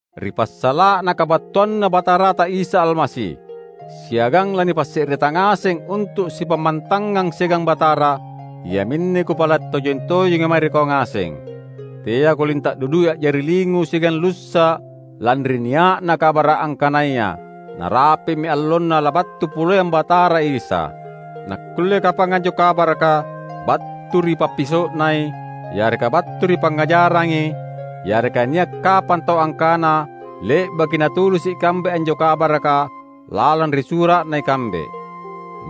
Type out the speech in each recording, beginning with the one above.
Ri passala’na kabattuanNa Batarata Isa Almasi, siagang lanipasse’reta ngaseng untu’ sipammantangang siagang Batara, iaminne kupala’ tojeng-tojenga mae ri kau ngaseng: Teako linta’ dudui a’jari lingu siagang lussa’ lanri nia’na kabara’ angkanaya narapi’mi allonna labattu poleang Batara Isa. Nakulle kapang anjo kabaraka battu ri pappiso’nai, yareka battu ri pangngajarangi; yareka nia’ kapang tau angkana le’baki natulisi’ ikambe anjo kabaraka lalang ri sura’na ikambe.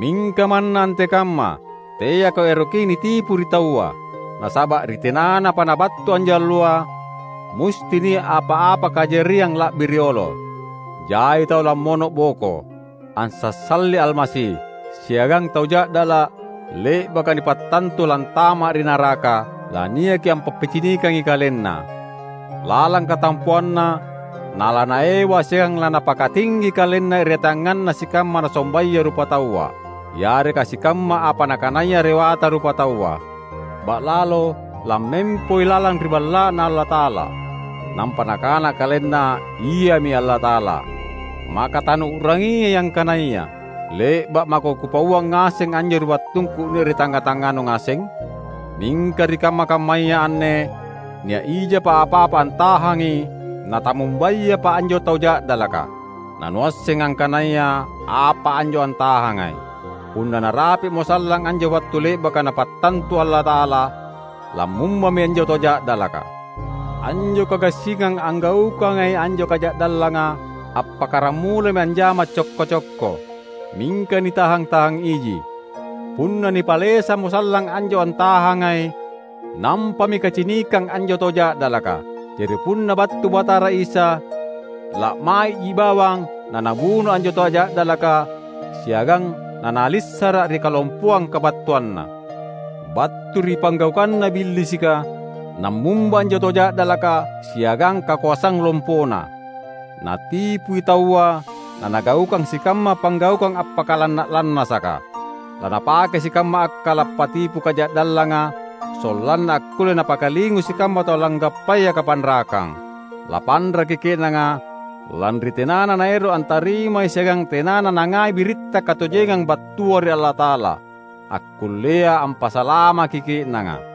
Mingka manna antekamma, teako eroki nitipu ri taua. Nasaba’ ri tenanapa nabattu anjo Alloa, musti nia’ apa-apa kajariang la’bi riolo: Jai tau lammono’boko, ansassali Almasi; siagang Tau Ja’dala’ le’baka nipattantu lantama’ ri naraka, laniaki ampappicinikangi kalenna. Lalang katampoanna nalanaewa siagang lanapakatinggi kalenna irateanganna sikamma nasombaya rupataua, yareka sikamma apa nakanaya rewata rupataua. Ba’lalo lammempoi lalang ri Balla’Na Allata’ala, nampa nakana kalenna iami Allata’ala. Maka tanuu’rangiai angkanaya le’ba’ mako kupauang ngaseng anjo ri wattungku nia’ ri tangnga-tangnganu ngaseng? Mingka ri kamma-kammaya anne nia’ ijapa apa-apa antahangi natammumbayapa anjo Tau Ja’dalaka; nanuasseng angkanaya apa anjo antahangai. Punna narapi’mo sallang anjo wattu le’baka Napattantu Allata’ala, lammumbami anjo Tau Ja’dalaka. Anjo kagassingang anggaukangai anjo kaja’dallanga appakkaramulami anjama cokko-cokko, mingka nitahang-tahangiji. Punna nipalesammo sallang anjo antahangai, nampami kacinikang anjo Tau Ja’dalaka. Jari punna battu Batara Isa, la’mai’ji bawang naNabuno anjo Tau Ja’dalaka siagang laNalissara’ ri kalompoang kabattuanNa. Battu ri panggaukanna Billisika nammumba anjo Tau Ja’dalaka siagang kakoasang lompona. Natipui taua nanagaukang sikamma panggaukang appakalanna’-lannasaka. Lanapakei sikamma akkala’ patipu kaja’dallanga sollanna akkulle napakalingu sikamma tau langgappaya kapanrakang. Lapanraki ke’nanga lanri tenana naero’ antarimai siagang tenana nangai biritta katojengang battua ri Allata’ala, akkullea ampasalamaki ke’nanga.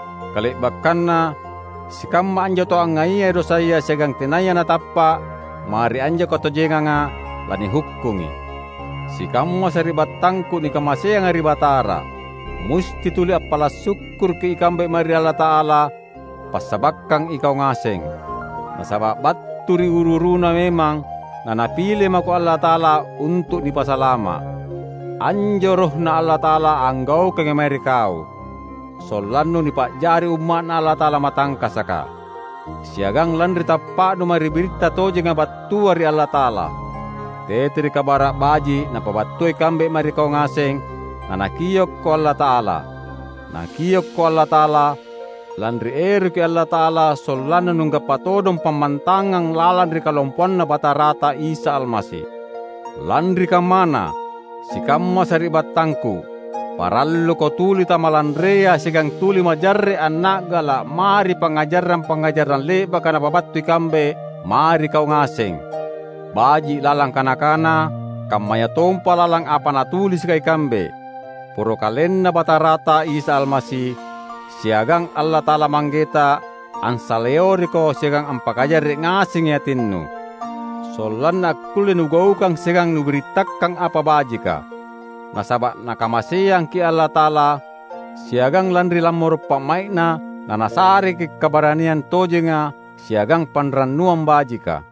Kale’bakkanna, sikamma anjo tau angngaiyai dosaya siagang tenaya natappa’ mae ri anjo katojenganga, lanihukkungi. Sikamma sari’battangku nikamaseanga ri Batara! Musti tuli appala’ sukkuruki ikambe mae ri Allata’ala passabakkang ikau ngaseng; nasaba’ battu ri uru-uruna memang naNapile mako Allata’ala untu’ nipasalama’. Anjo, RohNa Allata’ala anggaukangi mae ri kau; sollannu nipa’jari umma’Na Allata’ala matangkasaka; siagang lanri tappa’nu mae ri biritta tojenga battua ri Allata’ala. Tete ri Kabara’ Baji’ napabattua ikambe mae ri kau ngaseng naNakiokko Allata’ala. Nakiokko Allata’ala, lanri eroki Allata’ala sollanna nunggappa todong pammantangang lalang ri kalompoanNa Batarata Isa Almasi. Lanri kammana, sikamma sari’battangku, paralluko tuli tamalanrea siagang tuli majarre’ anna’gala’ mae ri pangngajarang-pangngajarang le’baka napabattu ikambe mae ri kau ngaseng, baji’ lalang kana-kana, kammayatompa lalang apa natulisika ikambe. Poro KalenNa Batarata Isa Almasi, siagang Allata’ala Manggeta ansaleoriko siagang ampakajarre’ ngasengi atinnu, sollanna akkulle nugaukang siagang nubirittakang apa bajika. Nasaba’ Nakamaseangki’ Allata’ala, siagang lanri lammoro’ pa’mai’Na naNasareki’ kabaraniang tojenga siagang panrannuang bajika.